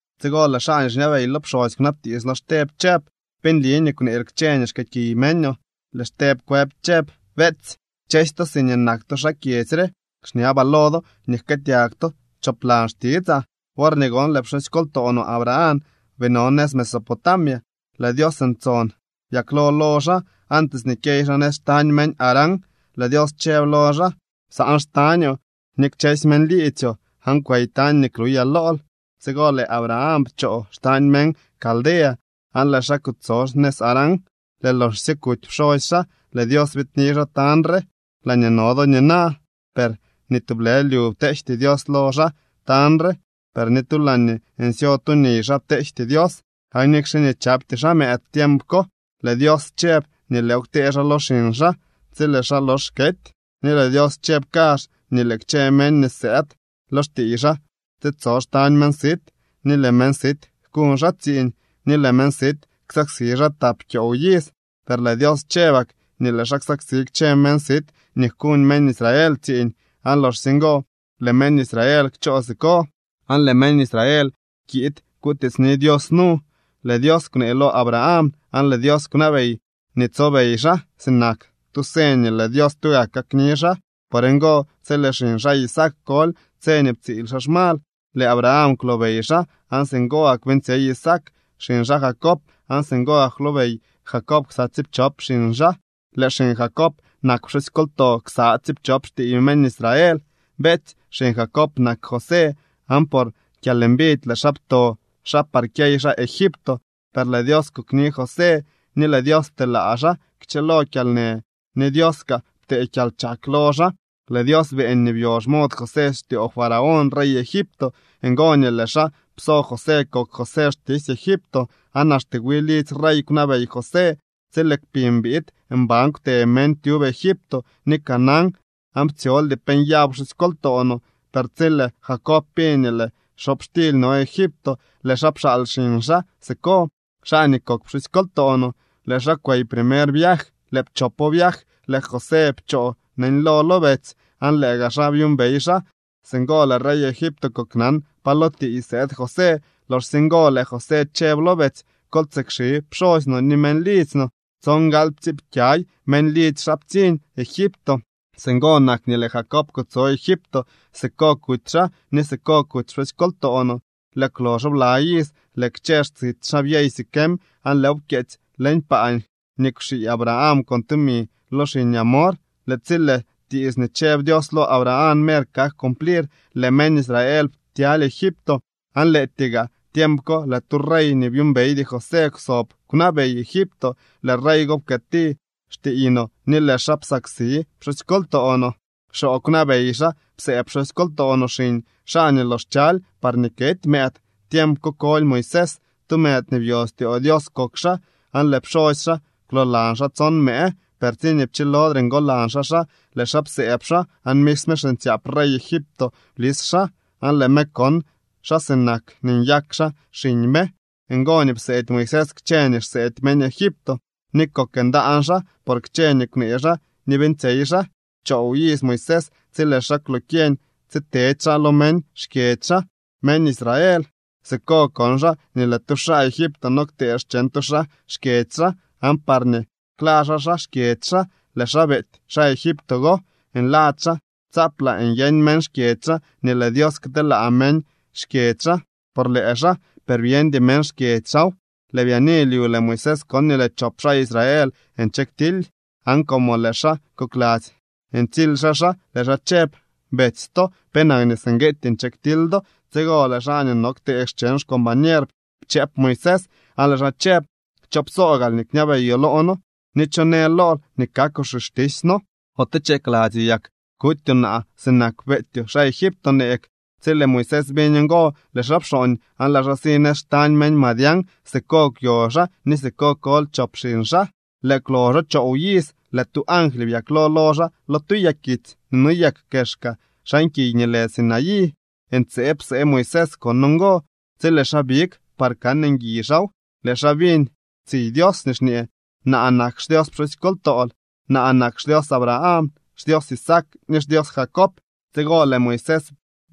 Tsigo lëë xaa nii xñabey lo pxosy kwnabtiits lo Xteb chëb: —¿Pe nli nii kwneel kchë nii xkëëkiy meñoo? Lëë Xteb kwëb chëb: —Beetsy, kchësy to siñee nak to xaa kyedzy re, xñabaa lo do nii jkëëtyag to choplan xtitsaa. Worñee gon lëë pxusykoltoo no Abraham bii no nëz Mesopotamia, lëë Dios ntson byaklo lo xaa, antes nii kyey xaa nëz xtañ meñ Harán, lëë Dios chëb lo xaa: “Psaan xtañoo ni kchësy meñ liidzyoo, aan kwey tañ nii kluyaa lool.” Tsigo lëë Abraham pchoo xtañ meñ Caldea aan lëë xaa kutso nëz Harán. Lëë loxsye kuty pxosy xaa, lëë Dios biidni xaa tañ re, laañee no do nina. Per ni tublë lyu pteejty Dios lo xaa tañ re, per ni tu laa nsyo tu niy xaa pteejty Dios. Aan nikxe nii chapty xaa mëëd tiemp ko, lëë Dios chëb nii lëëw ktee xaa lo xiñ xaa tsi lëë xaa lox kety. Ni lëë Dios chëb kazh nii lëë kchë meñ nii sëëd lo xtiiy xaa tsitso xtañ meñ sit, ni lëë meñ sit jkuñ xaa tsiiñ, ni lëë meñ sit ksaksi xaa tap kyoow iz. Per lëë Dios chëbak nii lëë xaa ksaksi kchë meñ sit nii jkuñ meñ Israel tsiiñ, aan loxsye ngo lëë meñ Israel kchoo siko, aan lëë meñ Israel kiid kutiitsni Dios nu. Lëë Dios kwnee lo Abraham, aan lëë Dios kwnabey nii tsobey xaa, sinak tu señ nii lëë Dios tugak kakni xaa. Por ngo, tsi lëë xiñ xaa Isaac koly, tse nii ptsiil xaa xmal, lëë Abraham kwlobey xaa, aan singo gak beeñtsyey Isaac xiñ xaa Jacob, aan singo gak kwlobey Jacob ksa tsiipchop xiñ xaa. Lëë xiñ Jacob nak pxusykoltoo ksa tsiipchop xtiiy meñ Israel. ’Betsy xiñ Jacob nak José, aan por kyalmbidy lëë xaa pto xaa par kyey xaa Egipto. Per lëë Dios kokni José, ni lëë Dios pteelaa xaa kchëlo kyalnë, ni Dios kaa ptee kyalchak lo xaa. Lëë Dios beeñ nii byo xmod José styoo Faraón rey Egipto. Ngo nii lëë xaa pso José kok José xtisy Egipto aan axte wi lidzy rey kwnabey José. ’Tsi lëë kpiñ biid, mban kwte meñ tyub Egipto ni Canaán, aan ptsyoldy pe nyaw pxusykoltoo no. Per tsi lëë Jacob biñ nii lëë xobxtily no Egipto, lëë xaa pxaal xiñ xaa siko, xaa nii kok pxusykoltoo no. Lëë xaa kwey primer viaj. Lëë pchopo viaj lëë José pchoo neñlo lo betsy, aan lëë gaa xaa byuumbey xaa. Singo lëë rey Egipto koknan pa lo tiiy sëëd José. Loxsye ngo lëë José chëb lo betsy: “Kol tsikxi pxosy no ni meñ lidzy no.” Tsongalyptsiipkyay meñ lidzy xaa ptsiñ Egipto. Singo nak nii lëë Jacob kutso Egipto, siko kuty xaa, ni siko kuty pxusykoltoo no. Lëë kwloxo bla iz lëë kchë xtsit xaa byey Siquem, aan lëëw pkyeetsy leñ paa nii kwxii Abraham con tumi lo xiñ Hamor. ’Lëë tsi lëë tiits nii chëb Dios lo Abraham mer kak cumplir, lëë meñ Israel ptyaly Egipto. Aan lëëtyee gaa tiemp ko lëë tu rey nii byuumbeydy José kwsob kwnabey Egipto. Lëë rey go pkëëti xtiiy no ni lëë xaa psaksi pxusykoltoo no, xoo kwnabey xaa psëëb pxusykoltoo no xiñ xaa nii lox chaly parñee kety mëëd. Tiemp ko koly Moisés. Tu mëëd nii byo styoo Dios kok xaa, aan lëë pxosy xaa kwloolan xaa tson mëë. Per tsiñee pchilodre ngolan xaa xaa, lëë xaa psëëb xaa, aan misme xiñtsyaap rey Egipto blis xaa, aan lëë me kon xaa sinak nii nyak xaa xiñ me. Ngo nii pseedy Moisés kchë nii xseedy meñ Egipto, ni kok ndaan xaa por kchë nii kwnee xaa ni beeñtsyey xaa. ’Choow iz Moisés tsi lëë xaa kwlokyeñ tsitedy xaa lo meñ xkyedzy xaa, meñ Israel. Siko kon xaa nii lëë tu xaa Egipto no ktee xcheñ tu xaa xkyedzy xaa. Aan parñee kla xaa xaa xkyedzy xaa, lëë xaa beety xaa Egipto go. Nladzy xaa tsaaplaa nyeñ meñ xkyedzy xaa nii lëë Dios kteelaa meñ xkyedzy xaa por lëë xaa, per byeñdy meñ xkyedzy xaaw. Lëë byaani lyu, lëë Moisés kon nii lëë chop xaa Israel nche ktily aan como lëë xaa kokladzy ntsily xaa xaa lëë xaa chëb: “Betsy to. ¿Penak nii singue nche ktily do?” Tsigo lëë xaa nii no ktee cheñ xcombañer pchëëp Moisés, aan lëë xaa chëb: “¿Cho psoo gaal nii kñabeyoo loo noo, ni cho në lool nii kakoo xixtisy noo? ¿Ote chakladzyoo yak kutyoo naa sinak beetyoo xaa Egipto neeg?” Tsi lëë Moisés biñ ngo, lëë xaa pxooñ aan lëë xaa si nëz xtañ meñ Madián. Siko kwyo xaa ni siko koly chop xiñ xaa. ’Lëë kwloxo choow iz, lëë tu angly byaklo lo xaa lo tu yakitsy nii noyek kexka xan kiy nii lë Sinaí. Ntseeb psee Moisés kon ngo. Tsi lëë xaa big par kan ngui xaaw, lëë xaa biñ tsiy Dios nii xñee: “Naa nak xDios pxusykoltool, naa nak xDios Abraham, xDios Isaac ni xDios Jacob.” Tsigo lëë Moisés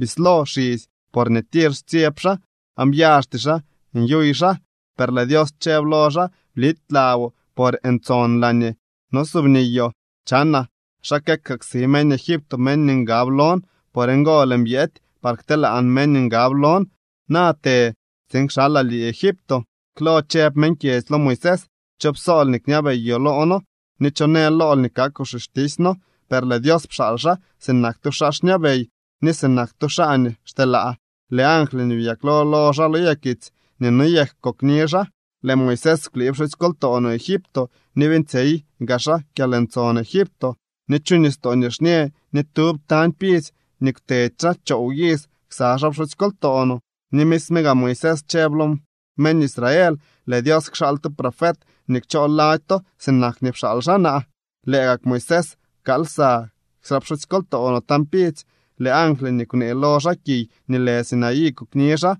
bislo xisy porñee tir xtsyeb xaa, aan byaxty xaa nyuy xaa. Per lëë Dios chëb lo xaa: “Blity laboo, por ntson laañee nosubniyoo. Chanaa xa këksaksi meñ Egipto meñ nii ngab lon. Por ngo lëën byety par kteelaan meñ nii ngab lon. Na të tsiin kxalaa lii Egipto.” ’Klo chëb meñ kyedzy lo Moisés: “¿Cho psool nii kñabeyoo loo noo ni cho në lool nii kakoo xixtisy noo?” Per lëë Dios pxaal xaa sinak tu xaa xñabey ni sinak tu xaa nii xteelaa. Lëë angly nii byaklo lo xaa lo yakitsy nii noyek kokni xaa. Lëë Moisés kwlii pxusykoltoo no Egipto, ni beeñtsyey gaa xaa kyalntson Egipto, ni chu Nistoo Nixñë, ni tyub tañ pidzy nii kwtedy xaa choow iz ksa xaa pxusykoltoo no. Ni misme gaa Moisés chëb lo meñ Israel: “Lëë Dios kxaal tu profet nii kchoo lady to, sinak nii pxaal xaa naa.” Lëë gak Moisés pkaal lsa ksa pxusykoltoo no tañ pidzy. Lëë angly nii kwnee lo xaa kiy nii lë Sinaí kokni xaa.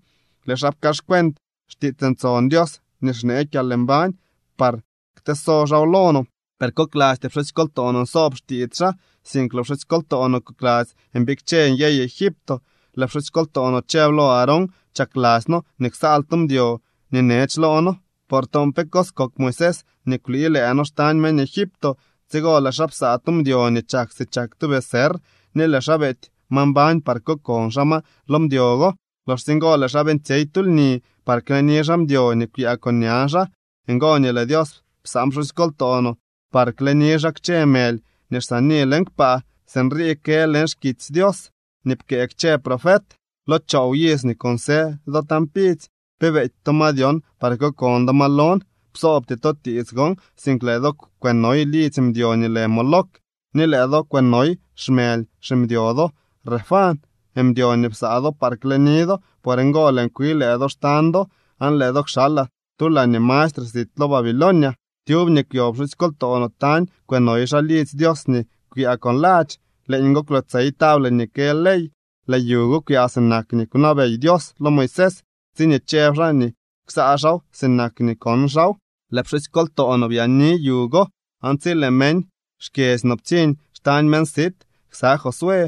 Lëë xaa pkaaxcuent xtiits ntson Dios nii xnee kyalmbañ par kteso xaaw lo no. ’Per koklasty pxusykoltoo no nsoob xtiits xaa, sink lëë pxusykoltoo no kokladzy mbikche nyey Egipto. Lëë pxusykoltoo no chëb lo Aarón: “Chakladzy noo nii ksaal tu mdyo nii nech loo noo, por toon pe cos kok Moisés nii kwlii lëë noo xtañ meñ Egipto.” Tsigo lëë xaa psaa tu mdyo nii chak si chak tu becerr, ni lëë xaa beety ma mbañ par kokon xaa ma lo mdyo go. Loxsye ngo lëë xaa beeñtsyey tu lni par kleni xaa mdyo nii kwyaa con ña xaa. Ngo nii lëë Dios psaan pxusykoltoo no par kleni xaa kchë mëly nii xsaani leñ kpaa. Sinrii kë leñ xkitsy Dios nii pkëë kchë profet: Lo choow iz nii kunsë do tañ pidzy, ¿pe beety to ma dyon, par kokon do ma lon? Psoobty to tiits gon, sink lëë do kwënoy lidzy mdyo nii lë Moloc, ni lëë do kwënoy xmëly ximdyo do Renfán, mdyo nii psaa do par kleni do. Por ngo lëën kwi lëë do xtañ do, aan lëë do kxalaa tu laañee mastre sit lo Babilonia. ’Tyub nii kwyo pxusykoltoo no tañ kwënoy xaa lidzy Dios nii kwyaa con ladx. Leeñgo kwyotsey table nii kë ley. Lëë yu go kwyaa sinak nii kwnabey Dios lo Moisés, tsiñee chëb xaa nii ksaa xaaw sinak nii kon xaaw. Lëë pxusykoltoo no byaani yu go aan tsi lëë meñ xkyedzy no ptsiñ xtañ meñ sit ksa Josué,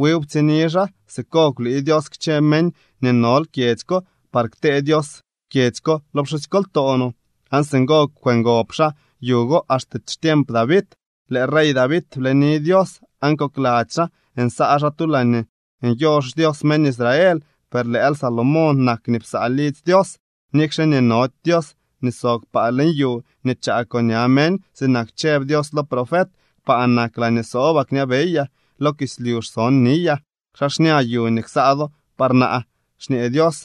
wiw ptsiñni xaa. Siko kwlii Dios kchë meñ nii nol kyedzy ko par ktee Dios kyedzy ko lo pxusykoltoo no. Aan singo kwëngob xaa yu go axte xtiemp David. Lëë rey David bleni Dios, aan kokladzy xaa nsaa xaa tu laañee nyo xDios meñ Israel. Per lëël Salomón nak nii psaa lidzy Dios. Nikxe nii nody Dios nii sob kpaa leñ yu nii chaa con ña meñ. Sinak chëb Dios lo profet: Kpaa nak laañee sobaa xñabeyaa, lo kislyu xson niyaa. ¿Xa xña yu nii ksaa do par naa? xñee Dios,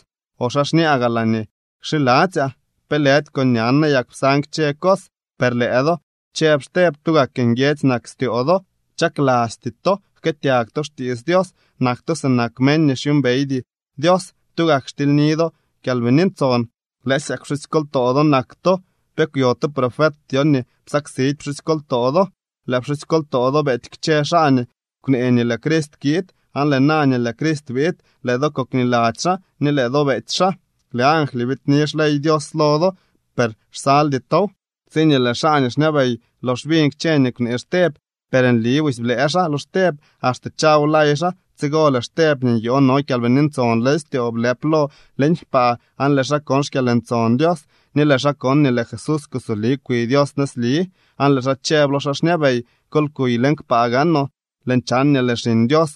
¿o xa xñaa gaa laañee kxiladzyaa? ¿Pe lëdy con ñan nayak psan kchë cos? ’Per lëë do, chëb Xteb, tugak nguiedzy nak styoo do. Chaklasty to jkëëtyag to xtiits Dios. Nak to sinak meñ nii xyuumbeydy Dios. Tugak xtilyni do Kyalbini Ntson. Lëësyak pxusykoltoo do nak to. ¿Pe kwyo tu profet dyon nii psaksidy pxusykoltoo do? Lëë pxusykoltoo do beety kchë xaa nii kwnee nii lëë Crist kiid, aan lëë na nii lëë Crist biid, lëë do kokniladzy xaa ni lëë do beety xaa. Lëë angly biidni xley Dios lo do, per xsaldy tow. Tsiñee lëë xaa xñabey lox biñ kchë nii kwnee Xteb, per nli busy blëë xaa lo Xteb axte chawlay xaa. Tsigo lëë Xteb nii nyoo no Kyalbini Ntson leñ styoo blëp lo leñ kpaa aan lëë xaa kon xkyalntson Dios, ni lëë xaa kon nii lëë Jesús kusoli kwi Dios nëzli. Aan lëë xaa chëb lo xaa xñabey: —¡Kol kuy leñ kpaa gaanoo! Lëën chan nii lëë Xiñ Dios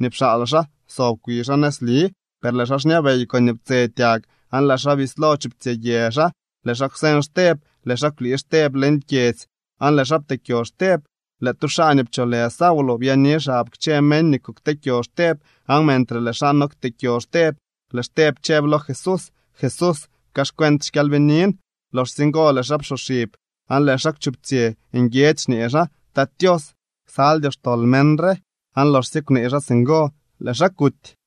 nii pxaal xaa so kwi xaa nëzli. Per lëë xaa xñabey koñee ptsetyag, aan lëë xaa bislo chuptsyë yë xaa, lëë xaa kwseñ Xteb. Lëë xaa kwlii Xteb leñ kyedzy aan lëë xaa pteekyo Xteb. Lëë tu xaa nii pcholë Saulo byaani xab kchë meñ nii kukteekyo Xteb. Aan mentre lëë xaa no kteekyo Xteb, lëë Xteb chëb lo Jesús: —Jesús, pkaaxcuent xkyalbiniin. Loxsye ngo lëë xaa psoxib aan lëë xaa kwchuptsyë nguiedzy xñee xaa: —Tat Tios, ksaldyoo xtol meñ re. Aan loxsye kwnee xaa singo, lëë xaa kuty.